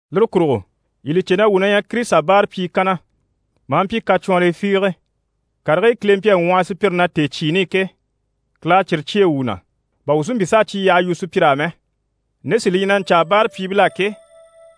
Lire kurugo yii li cè na wuu na ɲyɛ Kirisita báarapyii kanna, maa mpyi kacwɔnrii fiige. Karigii Kile mpyi a ŋwɔhɔ sùpyire na tèecyiini i ke, Kile à cyire cyêe wuu na, bà wuu si mpyi s'a cyi yyaha yu sùpyir'á mɛ. Nde sí li ɲyɛ na ɲcaa báarapyiibil'á ke,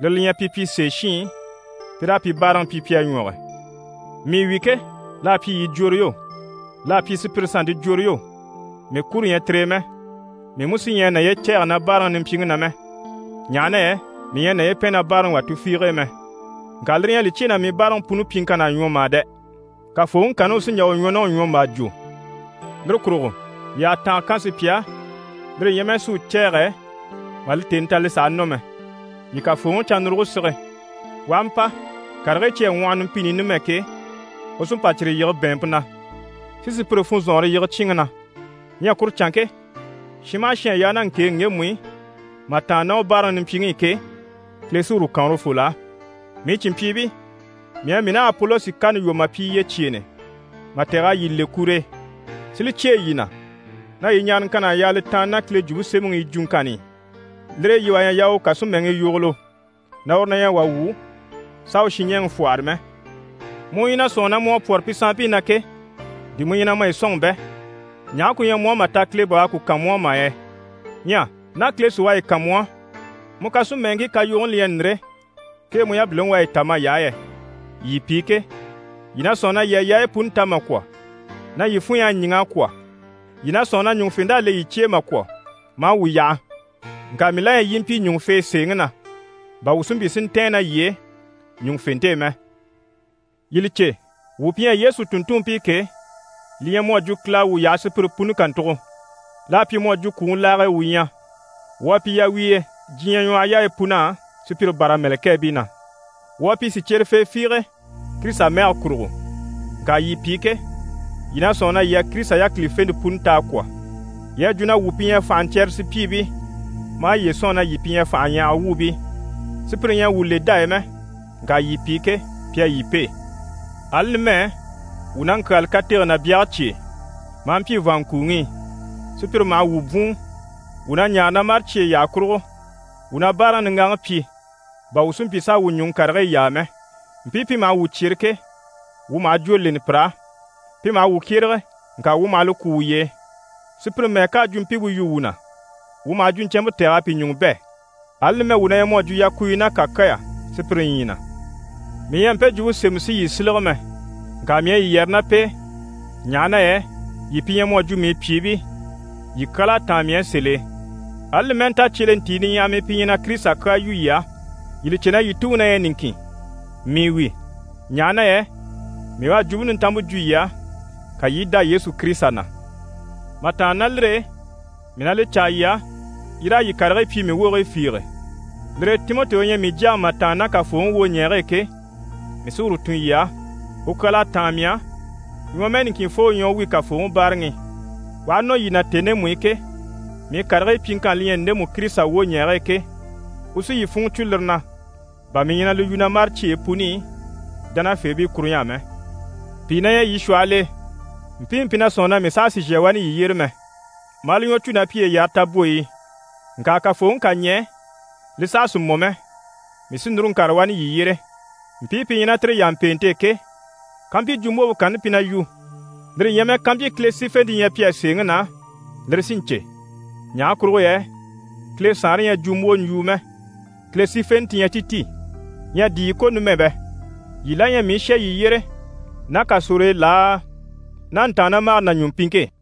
lire li ɲyɛ pi pyi sèeshiin pi raa pi báaraŋi pyi pi a ɲwɔge. Mii wi ke, l'à pyi yii jworo yo, l'à pyi sùpyire sannte jworo yo, mii kuro ɲyɛ tire e mɛ. Mii mú sí ɲyɛ a naye cɛ̂ɛgɛ na báaraŋi nimpyiŋi na mɛ, ɲaha na yɛ mii ɲyɛ a naye pɛn na báaraŋi wà tufiige e mɛ. Ŋka lire ɲyɛ a li cyêe na mii báaraŋi puni pyiŋkann'à ɲwɔ mà dɛ! Kafooŋi kanni u sí n‑jà u ɲwɔ ná u ɲwɔmbaa jwo. Lire kurugo yii àha tànga kan sùpya á, lire ɲyɛ mɛ si u cɛ̂ɛgɛ mà li tèni ta li sàha nɔ mɛ. Yii Kafooŋi cannuruge sige. U aha mpa, karigii cyi à ŋwɔhɔ numpini i numɛ ke, u sí n‑pa cyire yige bɛ̀ɛnmpe na, si sùpyire funzɔnŋɔre yige cyíinŋi na. Ɲyɛ kuru canŋke, shin maha shin à yaa ná ŋkèeŋi ŋgemu i mà tàanna ná u báaraŋi nimpyiŋi i ke, Kile sí uru kan urufol'á. Mii cìnmpyiibii, mii à mii ná Apolosi kani lwɔ́ a pyi yyecyeenɛ mà tɛ̀g'a yii le kur'e, si li cyêe yii na, na yii ɲaaraŋkann'à yaa li tàanna ná Kile Jwumpe Semɛŋi yi jwuŋkanni i. Lire e yii wà ɲyɛ a yaa u kàsimɛŋii yogolo na uru na ɲyɛ wà wu, s'a u shinɲɛɛŋi fwɔ́hɔre mɛ. Mu u ɲyɛ na sɔ̂nŋi na mu à pwɔ́rɔ pi sanmpii na ke, di mu ɲyɛ na maye sɔ̂nŋi bɛ? Ɲaha ku ɲyɛ mu á mà ta Kile bà u à ku kan mu á mà yɛ? Ɲyɛ ná Kile sí u à yi kan mu á, mu kàsimɛnŋkii kayogoni li ɲyɛ ndire, kee mu yabiliŋi u à yi ta may'á yɛ? Yii pi ke, yii na sɔ̂nŋi na yii à yaayi puni ta mà kwɔ̀, na yii funɲy'à ɲíŋ'a kwɔ̀, yii na sɔ̂nŋi na ɲùŋufent'à le yii cye e mà kwɔ̀, maa wuu yaha. Ŋka mii la ɲyɛ yii i mpyi ɲùŋufee sèeŋi na, bà wuu mú si mpyi si ntɛ̀ɛn ná yii e ɲùŋufente e mɛ. Yii li cè, wuu pi ɲyɛ Yesu tùnntunmpii ke, li ɲyɛ mu à jwo Kile à wuu yaha sùpyire puni kàntugo. L'à pyi mu à jwo kwùŋi laage e wuu ɲyɛ. Wuu à pyi yawiiye diɲyɛ ɲwɔhɔyaayi pun'á, sùpyire bâra mɛ̀lɛkɛɛbii na. Wuu à pyi sìcyerefee fiige Kirisita mɛge kurugo, ŋka yii pi ke, yii na sɔ̂nŋi na yii à Kirisita yákilifente puni ta a kwɔ̀. Yii à jwo na wuu pi ɲyɛ fànhaɲcyɛrɛrɛ sùpyiibii, maa yiye sɔ̂nŋi na yii pi ɲyɛ fànhaɲyahaga wuubii. Sùpyire ɲyɛ a wuu le dá e mɛ, ŋka yii pi ke, pi à yii pêe. Ali numɛ, wuu na ŋkyaali katege ná byage cye e, maa mpyi vàanŋkuuŋi i. Sùpyire maha wuu bwùun, wuu na ɲaare na mâre cyeyi yyaha kurugo. Wuu na báaraŋi niŋgaŋi pyi, bà wuu si mpyi s'a wuu ɲùŋɔ karigii yaa mɛ. Mpii pi maha wuu cyere ke, wuu maha jwó leni pir'á. Pi maha wuu kyérege, ŋka wuu maha li kwú wuye e. Sùpyire mɛ́ɛ ká a jwumpimpe yu wuu na, wuu maha jwuɲcɛnmpe tɛ̀g'a pi ɲùŋɔ bɛ̂. Ali numɛ wuu na ɲyɛ mu à jwo yakuuyo ná kàkyaya sùpyire ɲyii na. Mii ɲyɛ a mpe jwumpe sémɛ si yii sílege mɛ, ŋka mii à yii yɛrɛ ná p'e, ɲaha na yɛ yii pi ɲyɛ mu à jwo mii pyìibii, yii kyal'à táan mii á sèl'e. Ali li mɛ́ɛ nta cyelentii niɲyahaɲyahamii pi ɲyɛ na Kirisita kyaa yu yii á, yii li cè na yii tuŋi na ɲyɛ niŋkin. Mii wi, ɲaha na yɛ mii u à Jwumpe Nintanmpe jwo yii á, ka yii i dá Yesu Kirisita na. Mà tàanna ná lire e, mii na li caa yii á, yii raa yii karigii pyi mii wogigii fiige. Lire e Timɔti u ɲyɛ mii jyaŋi mà tàanna ná Kafooŋi wwoɲɛɛge e ke, mii sí uru tun yii á. U kyal'à táan mii á, ɲwɔmɛɛ niŋkinfoo u ɲyɛ u wi Kafooŋi báaraŋi i. U aha nɔ yii na tèni ndemu i ke, mii karigii pyiŋkanni li ɲyɛ ndemu Kirisita wwoɲɛɛge e ke, u sí yii funŋɔ cwo lire na, bà mii ɲyɛ na li yu na mâre cyeyi puni i dánafeebii kuruɲy'á mɛ. Pìi na ɲyɛ yii shwɔhɔl'e, mpiimu pi na sɔ̂nŋi na mii saha sì n‑shà wani yii yyére mɛ, maa li ɲwɔ cû na piye yare tabwoyi i. Ŋka Kafooŋi ká ɲɛɛ, li saha sì mɔ mɛ, mii sí núru n‑kàre wani yii yyére, mpii pi ɲyɛ ná tire yàmpeente e ke, kampyi jwumbwompe kanni pi na yu, lire ɲyɛ mɛ kampyi Kile sífente ɲyɛ pi á sèeŋi na, si lire cè. Ɲaha kurugo yɛ Kile Saanre ɲyɛ jwumbwoɲjwuu mɛ, Kile sífenɛ ti ɲyɛ ti ti. Ɲyɛ di yii ko numɛ bɛ? Yii la ɲyɛ mii u shà yii yyére ná kasor'e laa, ná ntàannamagare ná ɲùmpiŋke e?